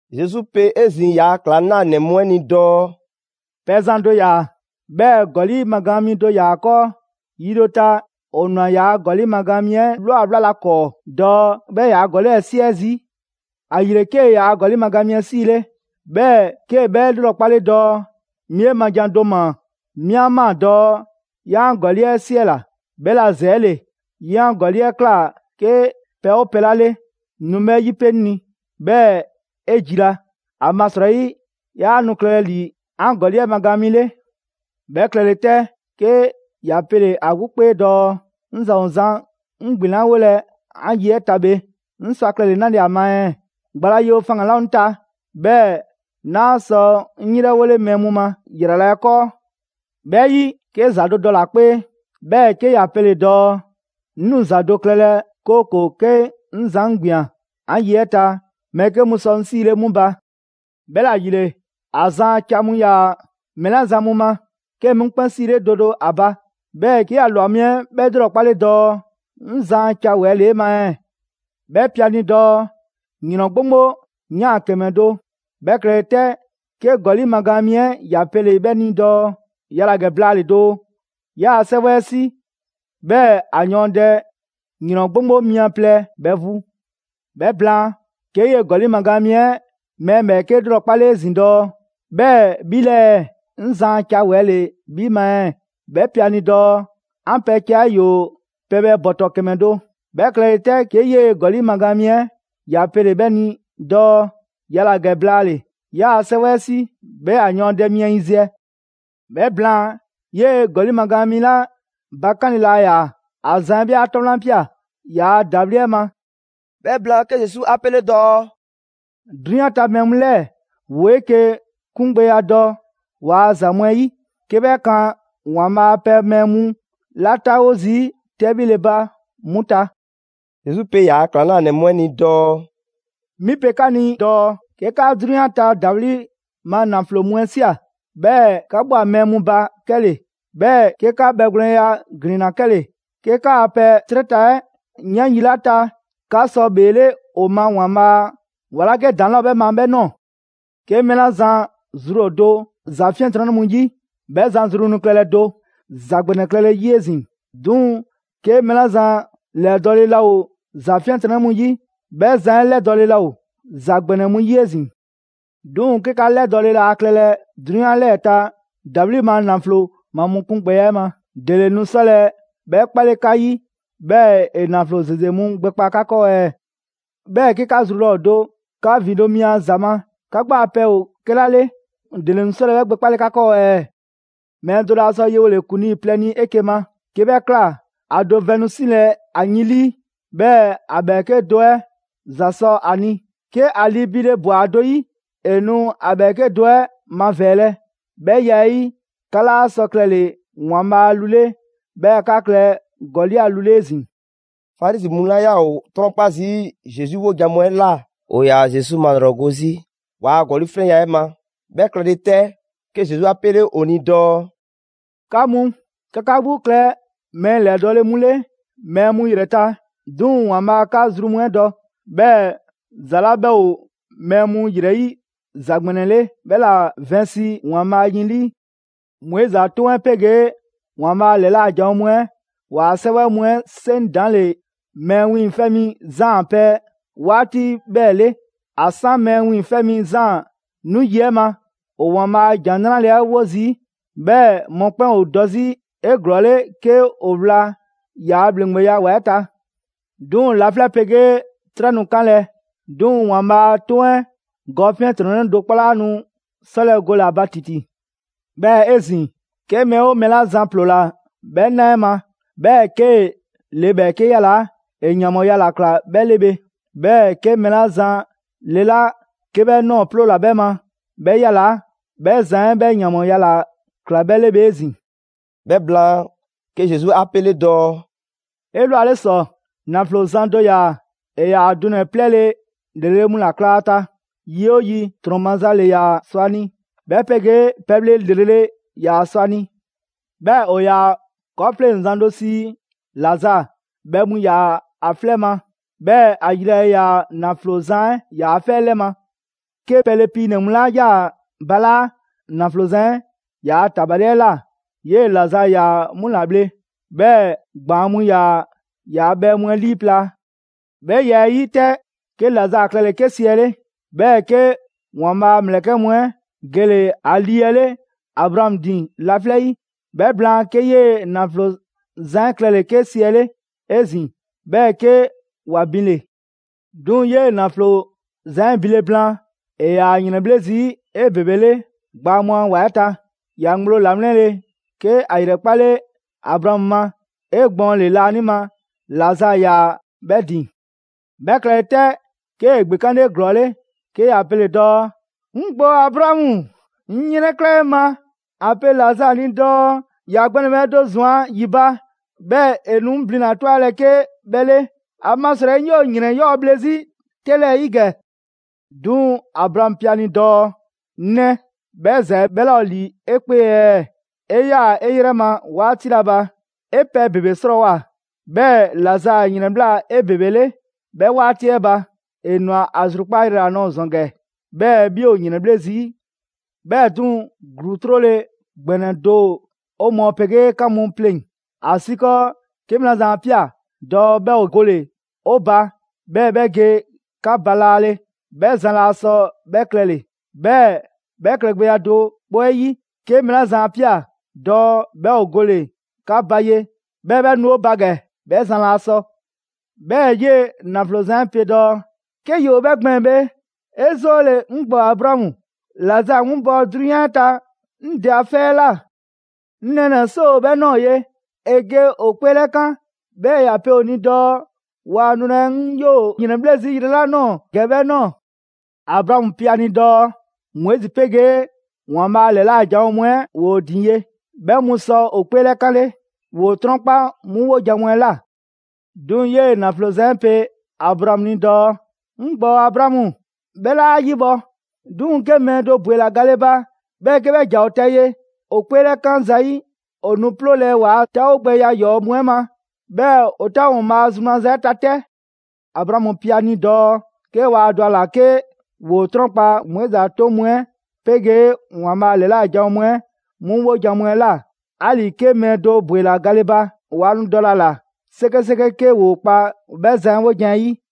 Zesu pe 'ezin‑ ‑yaa' ‑klaŋlanɛ mu 'ɛ ni dɔɔ: «Pɛzan do ‑yaa, 'bhɛɛ‑ ‑gɔli' magaan mi do ‑yaa ‑a 'kɔɔ. Yi do ta, ‑o ꞊nwa ‑yaa' ‑gɔli' magaan mi 'ɛ ꞊lwa 'wlalɛ‑ ‑a 'kɔɔ dɔɔ 'bhɛ ‑yaa' ‑gɔli' 'ɛ 'siɛ zii'. ‑Ayile, 'kee‑ yaa ‑gɔli' magaan mi 'ɛ 'siile, 'bhɛɛ‑ 'kee‑ 'bhɛ ‑lrɔkpale dɔɔ: ‹'Mi 'e ma jan do ‑maa. 'Mi 'a ꞊maa dɔɔ 'yaa 'an ‑gɔli' 'ɛ 'siɛla‑; 'bhɛla‑ ‑zɛɛle 'ye 'an ‑gɔli' 'ɛ ꞊kla 'ke pɛ 'oo pɛ 'la 'le, nu 'bhɛ 'yipe 'ŋ ni, 'bhɛɛ‑ 'e jila. ‑Amasrɔyi 'yaa nu klɛlɛ ‑li 'an ‑gɔli' 'ɛ magaan mi 'le.› 'Bhɛ klɛle 'tɛ, 'ke ‑ya pele‑ ‑a 'gbu 'kpee dɔɔ: ‹'Ŋ zan ‑o zan 'ŋ ‑gbinlawolɛ 'an ye 'ɛ ta bhe, 'ŋ sɔ ‑a klɛle‑ 'nale‑ ‑a ma ɛɛ? Gba la yewo faŋgan‑ 'laa ‑o 'ŋ ta, 'bhɛɛ‑ 'naa sɔ 'ŋ 'yrɛwole mɛɛ mu ma, ‑yrala' 'ɛ 'kɔɔ.› 'Bhɛ 'yi, 'ke ‑za do dɔle‑ ‑a 'kpee, 'bhɛɛ‑ 'ke ‑ya pele‑ dɔɔ: ‹'Ŋ nu ‑za do klɛlɛ 'kooko‑ 'ke 'ŋ zan 'ŋ ‑gbian 'an ye 'ɛ ta, mɛɛ 'ke mu sɔ 'ŋ 'sile 'mu ba.› 'Bhɛla‑ ‑yile, ‑a zan a ca mu ‑yaa mɛɛ 'la zan mu ma, 'kee‑ 'mu 'kpɛn 'siile do do ‑a ba. 'Bhɛɛ‑ 'ke ‑ya ‑lwa mi 'ɛ 'bhɛ 'lrɔkpale dɔɔ: ‹'Ŋ zan a ca ‑wɛɛ' ‑le 'e ma ɛɛ?› 'Bhɛ pe ‑a ni dɔɔ: ‹‑Yrɔn 'gboŋgbo 'yan ‑kɛmɛ do.› 'Bhɛ klɛle 'tɛ, 'ke ‑gɔli' magaan mi 'ɛ ‑ya pele‑ 'bhɛ ni dɔɔ: ‹Yala‑ ‑gɛ blaale‑ doo, 'yaa‑ 'sɛwɛ 'ɛ 'si, 'bhɛɛ‑ ‑a yɔɔndɛ ‑yrɔn 'gboŋgbo mia plɛ bhɛ vu.› 'Bhɛ blaan, 'ke 'yee‑ ‑gɔli' magaan mi 'ɛ ‑e mɛɛ ‑bhɛɛke' ‑lrɔkpale 'ezin‑ dɔɔ: ‹'Bhɛɛ‑ 'bhi 'lɛɛ‑, 'ŋ zan a ca ‑wɛɛ' ‑le 'bhi ma ɛɛ?› 'Bhɛ pe ‑a ni dɔɔ: ‹'An pɛ ca 'ɛ ‑yoo pɛbhɛ ‑bɔtɔ ‑kɛmɛ do.› 'Bhɛ klɛle 'tɛ 'ke 'yee‑ ‑gɔli' magaan mi 'ɛ ‑ya pele‑ 'bhɛ ni dɔɔ: ‹Yala‑ ‑gɛ blaale‑, 'yaa‑ 'sɛwɛ 'ɛ 'si, 'bhɛɛ‑ ‑a yɔɔndɛ mia yiziɛ.› 'Bhɛ blaan, 'yee‑ ‑gɔli' magaan mi 'la bakanle laa ‑yaa, ‑a zan 'ɛ 'bhɛ 'a 'tɔ 'wlan ꞊pia ‑yaa' ‑dawliya 'ɛ ma.» 'Bhɛ blaan, 'ke Zesu 'a 'pele dɔɔ: «'Drunyan ta mɛɛ mu 'lɛɛ‑ ‑woo 'eke‑ 'kungbɛya dɔ ‑waa' ‑za mu 'ɛ 'yi, 'ke 'bhɛ kan ‑Waanbhaa' a pɛ mɛɛ mu 'la 'taawo zii' 'tɛbhile ba 'mu ta.» Zesu pe ‑yaa' ‑klaŋlanɛ mu 'ɛ ni dɔɔ: «'Mi pe 'ka ni dɔɔ 'ke 'ka 'drunyan ta ‑dawli' ma ‑naflo mu 'ɛ ꞊sia, 'bhɛɛ‑ 'ka ꞊bhwa mɛɛ mu ba 'kɛle‑, 'bhɛɛ‑ 'ke 'ka bhɛgwlɛnya ‑glinna 'kɛle‑, 'ke 'kaa pɛ 'trɛ ta 'ɛ ꞊yaan yi 'la ta, 'ka sɔ ‑bheele' ‑o ma ‑Waanbhaa' a ‑wa 'la 'ke ‑daŋ' 'laa ‑o 'bhɛ ma 'bhɛ ꞊nɔɔ. 'Ke mɛɛ 'la zan zru ‑o do ‑za 'fiɛntrɔnnɛ mu 'yi, 'bhɛ zan zru nu klɛlɛ do ‑za ‑gbɛnɛ klɛle‑ 'yi 'ezin‑. 'Duŋ‑ 'ke mɛɛ 'la zan ‑lɛdɔɔle laa ‑o ‑za 'fiɛntrɔnnɛ mu 'yi, 'bhɛ zan 'ɛ ‑lɛdɔɔle laa ‑o ‑za ‑gbɛnɛ mu 'yi 'ezin‑. 'Duŋ‑ 'ke 'ka 'lɛdɔɔle laa klɛlɛ 'drunyan 'lɛɛ‑ ta ‑dawli' ma ‑naflo ma mu 'kungbɛya 'ɛ ma, ‑dele nu 'sɔlɛ‑ 'bhɛ 'kpale 'ka 'yi, 'bhɛɛ‑ ‑e ‑naflo ‑zeze mu gbɛkpa 'ka 'kɔɔ ɛɛ? 'Bhɛɛ‑ 'ke 'ka zru laa ‑o do 'ka ‑vindo' mi a ‑za ma, 'ka 'gbu a pɛ ‑o 'kɛla 'le, ‑dele nu 'sɔlɛ‑ 'bhɛ gbɛkpale 'ka 'kɔɔ ɛɛ?» «Mɛɛ do laa sɔ yewole ‑kuŋlii plɛ ni 'eke‑ ma. 'Kee‑ 'bhɛ ꞊kla, ‑a do vɛn nu 'silɛ‑ ‑a yin 'lii, 'bhɛɛ‑ ‑a ‑bhɛɛke' do 'ɛ ‑za sɔ a ni. 'Ke ‑a lii biile ꞊bwa ‑a do 'yi, ‑e nu ‑a ‑bhɛɛke' do 'ɛ mavɛɛlɛ. 'Bhɛ ya 'ɛ 'yi, 'ka 'laa sɔ klɛle‑ ‑Waanbhaa' a lu 'le, 'bhɛɛ‑ 'ka klɛ ‑gɔli' a lu 'le 'ezin‑.» Farizi mu 'la 'yaa‑ ‑o 'trɔnkpa zii' Zesu 'wojan‑ mu 'ɛ ꞊la, ‑o ‑yaa Zesu malrɔgo 'zi, ‑waa' ‑gɔli' 'flɛnya‑ 'ɛ ma. 'Bhɛ klɛle 'tɛ, 'ke Zesu 'a 'pele ‑o ni dɔɔ: «'Ka mu, 'ka 'ka 'gbu klɛ mɛɛ ‑lɛdɔɔle mu 'le mɛɛ mu ‑yrɛ ta. 'Duŋ‑ ‑Waanbhaa' 'ka zru mu 'ɛ dɔ. 'Bhɛɛ‑ ‑za 'la 'bhɛ ‑o mɛɛ mu ‑yrɛ 'yi ‑za ‑gbɛnɛ 'le, 'bhɛ ‑la vɛnsi ‑Waanbhaa' yin 'lii.» «Moizi a 'toŋ 'ɛ 'pegee ‑Waanbhaa' a ‑lɛla' janwo mu 'ɛ ‑waa 'sɛwɛ mu 'ɛ 'seŋ ‑daŋ' ‑le Mɛɛ Wiiŋfɛ' Mi Zaan a pɛ 'waati 'bhɛɛ‑ 'le. ‑A 'san Mɛɛ Wiiŋfɛ' Mi Zaan 'nu yi 'ɛ ma, ‑o ‑Waanbhaa' a ‑Jan 'Nrale 'ɛ 'wo zii', 'bhɛɛ‑ mɔkpɛn' ‑o dɔ 'zi 'eglɔɔle 'ke ‑o wla ‑yaa' ‑bhleŋgbeya ‑wa 'ɛ ta. 'Duŋ‑ laflɛ' 'pegee 'trɛ nu 'kanlɛ‑, 'duŋ‑ ‑Waanbhaa' 'a 'toŋ 'ɛ gɔ 'fiɛntrɔnnɛ do 'kpɔ 'laa nu 'sɔlɛ‑ gole‑ ‑a ba ‑titi.» «'Bhɛɛ‑ 'ezin‑, 'ke mɛɛ 'oo mɛɛ 'la zan ‑ploola 'bhɛ 'na 'ɛ ma, 'bhɛɛ‑ 'kee‑ le ‑bhɛɛke' 'yalaa‑, ‑e ‑yanbhɔɔya ‑la ꞊kla 'bhɛ 'le bhe. 'Bhɛɛ‑ 'ke mɛɛ 'la zan le 'la 'ke 'bhɛ ꞊nɔɔ ‑ploola 'bhɛ ma 'bhɛ 'yalaa‑, 'bhɛ zan 'ɛ 'bhɛ ‑yanbhɔɔya ‑la ꞊kla 'bhɛ 'le bhe 'ezin‑.» 'Bhɛ blaan, 'ke Zesu 'a 'pele dɔɔ: «'Elwale ‑sɔ, ‑naflo zan do ‑yaa; ‑e ‑yaa dunɛ‑ 'plɛɛle‑ ‑lrele' mu ‑la kla ‑a ta. Yi 'oo yi, ‑trɔn maza ‑le ‑yaa sɔ ‑a ni, 'bhɛ 'pegee pɛbhle ‑lrele' ‑yaa sɔ ‑a ni. 'Bhɛɛ‑ ‑o ‑yaa 'kɔɔfleŋzan do sii Lazaa. Bhɛ mu ‑yaa ‑a 'flɛ 'ɛ ma, 'bhɛɛ‑ ‑a yilale ‑yaa ‑naflo zan 'ɛ ‑yaa 'fɛ 'ɛ 'lɛ ma. 'Ke pɛle piinɛ‑ mu 'la 'yaa‑ balaa' ‑naflo zan 'ɛ ‑yaa ‑tabali 'ɛ ꞊la, 'yee‑ Lazaa ‑yaa 'mu ‑la bhle. 'Bhɛɛ‑ ‑gbaan' mu ‑yaa ‑yaa' bhɛ mu 'ɛ 'liiplaa‑. 'Bhɛ ya 'ɛ 'yi 'tɛ, 'ke Lazaa klɛle‑ 'ke siɛle', 'bhɛɛ‑ 'ke ‑Waanbhaa' a ‑mlɛkɛ' mu 'ɛ gele‑ ‑a lii 'ɛ 'le Abraamu ‑din laflɛ' 'yi. 'Bhɛ blaan, 'ke 'yee‑ ‑naflo zan 'ɛ klɛle‑ 'ke siɛle' 'ezin‑, 'bhɛɛ‑ 'ke ‑wa binle‑. 'Duŋ‑ 'yee‑ ‑naflo zan 'ɛ binle blaan, ‑e ‑yaa ‑yrɛnbhle' zii' 'ebebele gbaa mu a ‑wa 'ɛ ta. ‑Ya ŋgblo ‑lawlɛnle 'ke ‑a ‑yrɛkpale Abraamu ma 'egbɔɔnle laanima. Lazaa ‑yaa 'bhɛ ‑din. 'Bhɛ klɛle 'tɛ, 'kee‑ ‑gbekanle 'eglɔɔle, 'ke ‑ya pele‑ dɔɔ: ‹'Ŋ ‑gbɔɔ Abraamu, 'ŋ 'yrɛnkla 'e ma, ‑a pe Lazaa ni dɔɔ ‑ya gbɛ ‑nɛbhɛ' do ꞊zwan ‑yi ba, 'bhɛɛ‑ ‑e nu 'ŋ blina‑ 'ɛ 'twalɛ‑ 'ke 'bhɛ 'le, ‑amasrɔyi 'ŋ 'yoo‑ ‑yrɛn 'yɔɔ‑ bhle 'zi 'tɛ 'lɛɛ‑ 'yi ‑gɛ.› 'Duŋ‑ Abraamu pe ‑a ni dɔɔ: ‹'Ŋ 'nɛ, 'bhɛ ‑za 'ɛ 'bhɛ 'laa ‑o ‑li 'e 'kpee ɛɛ, 'e 'yaa‑ 'e 'yrɛ ma 'waati 'la ba, 'e pɛ ‑bebe 'srɔɔwoa‑, 'bhɛɛ‑ Lazaa ‑yrɛnbhla 'ebebele 'bhɛ 'waati 'ɛ ba. ‑E ꞊nwa ‑a zrukpaa' yrɛ ‑la nɔɔ‑ ‑zɔn ‑gɛ, 'bhɛɛ‑ 'bhi ‑o ‑yrɛnbhle' zii'. 'Bhɛɛ‑ 'duŋ‑, ‑gluu 'trole‑ ‑gbɛnɛ do ‑o 'o mɔɔ 'pegee 'ka mu pleŋ‑; ‑asiikɔɔ 'ke mɛɛ 'la zan 'a ꞊pia‑ dɔɔ 'bhɛ ‑o gole‑ 'o ba, 'bhɛɛ 'bhɛ ge 'ka ba laale, 'bhɛ zan laa sɔ 'bhɛ klɛle‑. 'Bhɛɛ‑ 'bhɛ klɛgbɛya do 'kpɔ 'ɛ 'yi, 'ke mɛɛ 'la zan 'a ꞊pia dɔɔ 'bhɛ ‑o gole‑ 'ka ba ye, 'bhɛɛ‑ 'bhɛ nu 'o ba ‑gɛ, 'bhɛ zan laa sɔ.› 'Bhɛɛ‑ 'yee‑ ‑naflo zan 'ɛ pe dɔɔ: ‹'Ke ‑yoo 'bhɛ gbɛɛn‑ bhe, 'e 'zoole‑ 'ŋ ‑gbɔɔ Abraamu, Lazaa 'winbɔ‑ 'drunyan ta 'ŋ dɛ a 'fɛ 'ɛ ꞊la. 'Ŋ nɛɛnɛ‑ 'soo ‑o 'bhɛ ꞊nɔɔ ye, ‑e ge ‑o 'kpeelɛkan, 'bhɛɛ‑ ‑ya pe ‑o ni dɔɔ waa nulɛ 'ŋ 'yoo‑ ‑yrɛnbhle' zii' yrɛ 'la ꞊nɔɔ ‑gɛ 'bhɛ ꞊nɔɔ.› Abraamu pe ‑a ni dɔɔ: ‹Moizi 'pegee ‑Waanbhaa' ‑lɛla' janwo mu 'ɛ ‑woo ‑o ‑din ye. 'Bhɛ mu sɔ ‑o 'kpeelɛkanle, ‑woo 'trɔnkpa 'mu 'wojan‑ mu 'ɛ ꞊la.› 'Duŋ‑ 'yee ‑naflo zan 'ɛ pe Abraamu ni dɔɔ: ‹'Ŋ ‑gbɔɔ Abraamu, 'bhɛ 'laa 'a 'yibhɔ‑. 'Duŋ‑ 'ke mɛɛ do ‑bwela gale ba, 'bhɛɛ‑ 'ke 'bhɛ ‑ja ‑o ta ye, ‑o 'kpeelɛkan zayi', ‑o nu 'ploolɛ‑ ‑waa' 'taawogbɛya 'yɔɔ‑ mu 'ɛ ma, 'bhɛɛ‑ ‑o 'taawo‑ ‑Waanbhaa' a zru maza 'ɛ ta 'tɛ.› Abraamu pe ‑a ni dɔɔ: ‹'Ke waa dɔ ‑a ‑la 'ke ‑woo 'trɔnkpa Moizi a 'toŋ mu 'ɛ 'pegee ‑Waanbhaa' ‑lɛla' janwo mu 'ɛ 'mu 'wojan‑ mu 'ɛ ‑la, 'ali‑ 'ke mɛɛ do ‑bwela gale ba, 'waa nu dɔlɛ ‑a ꞊la 'sekeseke 'ke ‑woo kpa 'bhɛ zan 'ɛ 'wojan‑ 'ɛ 'yi.›»